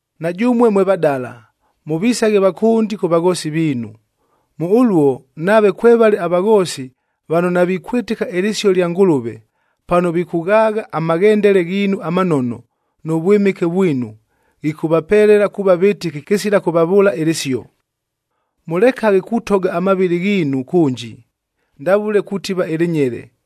Na jʉmue mwe vadala, mʉvisaghe vakʉndi kʉ vaghoosi viinu. Mʉ ʉluo, nave kwevale avaghoosi vano navikwɨtɨka ɨlɨsio lya Ngʉlʉve, pano vikʉghaagha amaghendele ghiinu amanono, nʉ vwɨmɨke vwinu, ghikʉvapelela kuuva vɨtɨki kɨsila kʉvavʉʉla ɨlɨsio. Mʉlekaghe kutoga amavɨlɨ ghiinu kʉnji, ndavʉle kutiva ɨlɨnyele,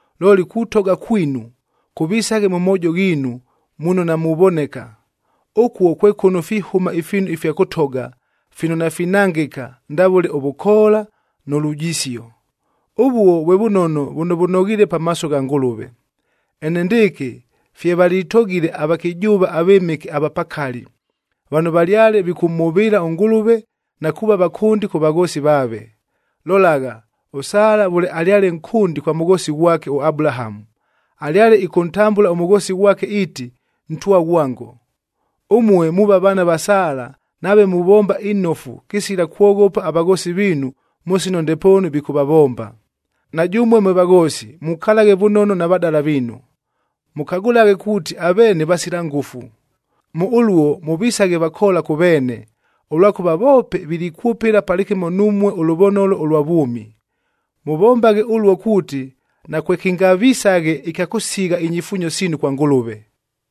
Looli kutoga kwinu kʉvisaghe mʉ moojo ghiinu muno namuvoneka. Ʉkuo kwe kʉno fihʉma ifiinu ifya kʉtoga fino nafinangɨka ndavʉle ʉvʉkoola nʉ lujisio. Ʉvuo vwe vʉnono vʉno vʉnoghiile pamaaso gha Ngʉlʉve. Enendɨɨkɨ fye valitogile avakɨjʉʉva avɨmɨke ava pakali, vano valyale vikʉmhʉvɨɨla ʉNgʉlʉve na kuuva vakʉndi kʉ vaghoosi vaave. Lolagha, ʉSala vʉle alyale nkʉndi kwa mʉghoosi ghwake ʉAbulahamu, alyale ɨkʉntambʉla ʉmʉghoosi ghwake iiti, “Ntwa ghwango.”b Ʉmue muuva vaana va Sala nave muvomba inofu kɨsila kwoghopa avaghoosi viinu mʉ sino ndepoonu vikʉvavomba. Na jʉmue mwe vaghoosi mukalaghe vʉnono na vadala viinu. Mʉkagʉlaghe kuuti aveene vasila ngʉfu. Mʉ ʉluo mʉvisaghe vakoola kʉ veene, ʉlwakʉva voope vilikwʉpɨla palɨkɨmo numue ʉlʉvonolo ʉlwa vwʉmi. Mʉvombaghe ʉluo kuuti, nakwekɨngavisaghe ɨkya kʉsigha inyifuunyo siinu kwa Ngʉlʉve.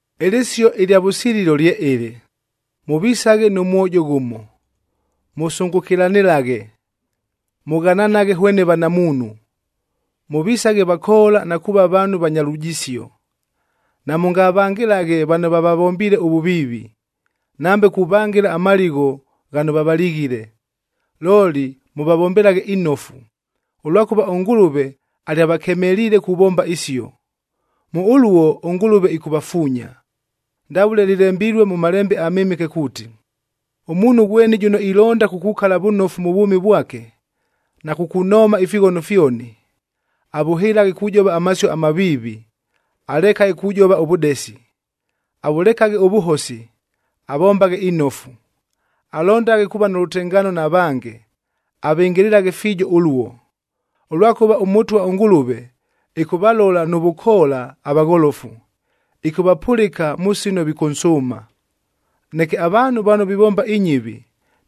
Ɨlɨsio ɨlya vʉsililo lye ɨlɨ: mʉvisaghe nʉ mwojo ghʉmo, mʉsʉngʉkɨlanɨlaghe, mʉghananaghe hwene vanamuunhu, mʉvisaghe vakoola na kuuva vaanhu vanya lujisio. Namʉngavangɨlaghe vano vavavombiile ʉvʉviivi, nambe kuvangɨla amaligho ghano vavalighile, looli mʉvavombelaghe inofu, ʉlwakʉva ʉNgʉlʉve alyavakemeliile kuvomba isio. Mʉ ʉluo ʉNgʉlʉve ɨkʉvafuunya. Ndavʉle lɨlembilue mʉ Malembe aMɨmɨke kuuti, “Ʉmuunhu ghweni jʉno ilonda kukukala vʉnofu mʉ vwʉmi vwake, na kukunooma ifighono fyoni, avʉhɨlaghe kujova amasio amaviivi, alekaghe kujova ʉvʉdesi. Avʉlekaghe ʉvʉhosi, avombaghe inofu. Alondaghe kuuva nʉ lʉtengaano na vange, avɨngɨlɨlaghe fiijo ʉluo. Ʉlwakʉva ʉMʉtwa ʉNgʉlʉve ɨkʉvalola nʉ vʉkoola avagholofu, ɨkʉvapʉlɨka mʉ sino vikʉnsʉʉma. Neke avaanhu vano vivomba inyɨvi,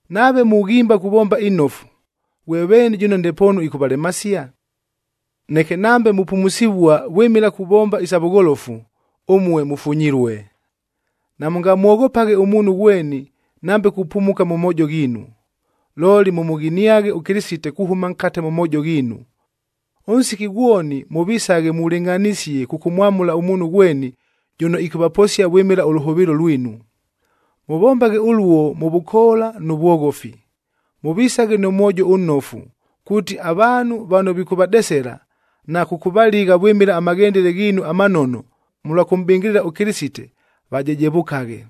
Nave mughimba kuvomba inofu, ghwe veeni jʉno ndepoonu ɨkʉvalemasia? Neke nambe mupumusivua vwɨmɨla kuvomba isa vʉgholofu, ʉmue mʉfunyilue. Namʉngamwoghopaghe ʉmuunhu ghweni nambe kupumuka mʉ moojo ghiinu, looli mʉmʉghiniaghe ʉKɨlɨsite kuhʉma nkate mʉ moojo ghiinu. Ʉnsiki ghwoni mʉvisaghe mulɨngʼhanisie kʉkʉmwamʉla ʉmuunhu ghweni jʉno ɨkʉvaposia vwɨmɨla ʉlʉhʉvɨɨlo lwinu. Mʉvombaghe ʉluo mʉ vʉkoola nʉ vwoghofi. Mʉvisaghe nʉ mwojo ʉnnofu, kuuti avaanhu vano vikʉvadesela, na kʉkʉvaligha vwɨmɨla amaghendele ghiinu amanono mʉlwa kʉmʼbɨngɨlɨla ʉKɨlɨsite, vajejevʉkaghe.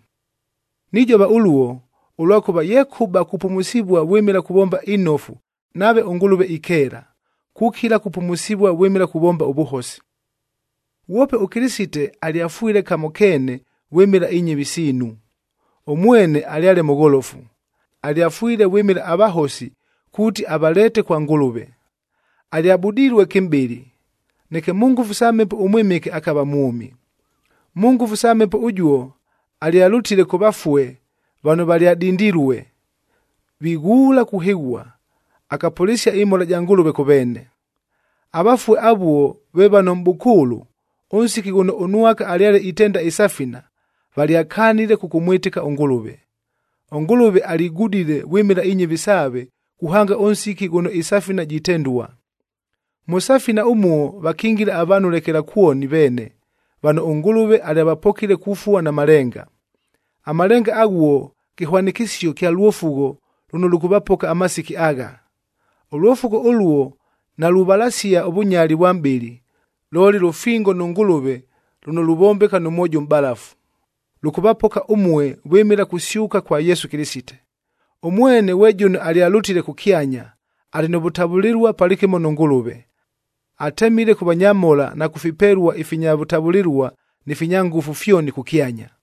Nijova ʉluo, ʉlwakʉva yekʉba kupumusivua vwɨmɨla kuvomba inofu nave ʉNgʉlʉve ikeela, kukila kupumusivua vwɨmɨla kuvomba ʉvʉhosi. Ghwope ʉKɨlɨsite alyafwile kamo keene vwɨmɨla inyɨvi siinu. Ʉmwene alyale mʉgholofu, alyafwile vwɨmɨla avahosi kuuti avaleete kwa Ngʉlʉve. Alyabudilue kɨmʼbɨlɨ, neke mʉ ngʉfu sa Mhepo ʉMwɨmɨke akava mwʉmi. Mʉ ngʉfu sa Mhepo ʉjuo alyalʉtile kʉ vafue vano valyadindilue, vighuula kuhɨghua, akapʉlɨsia ɨmhola ja Ngʉlʉve kʉ veene. Avafue avuo ve vano mʼbʉkʉʉlʉ, ʉnsiki ghʉno ʉNwaka alyale itenda ɨsafina, valyakanile kʉkʉmwɨtɨka ʉNgʉlʉve. ɄNgʉlʉve aligudile vwɨmɨla inyɨvi saave kuhanga ʉnsiki ghʉno ɨsafina jitendua. Mʉ safina ʉmuo vakingila avaanhu lekelakwoni veene vano ʉNgʉlʉve alyavapokile kufua na malenga. Amalenga aghuo kɨhwanɨkɨsio kya lwofugho lʉno lʉkʉvapoka amasiki agha. Ʉlwofugho ʉluo naluvalasia ʉvʉnyali vwa mʼbɨlɨ, looli lʉfingo nʉ Ngʉlʉve lʉno luvombeka nʉ mwojo ʉmʼbalafu. Lʉkʉvapoka ʉmue vwɨmɨla kusyʉka kwa Yesu Kɨlɨsite. Ʉmwene ghwe jʉno alyalʉtile kʉkyanya, alɨ nʉ vʉtavʉlɨlua palɨkɨmo nʉ Ngʉlʉve. Atemile kʉ vanyamhola na kʉ fipelua ifinya vʉtavʉlɨlua ni finya ngʉfu fyoni kʉkyanya.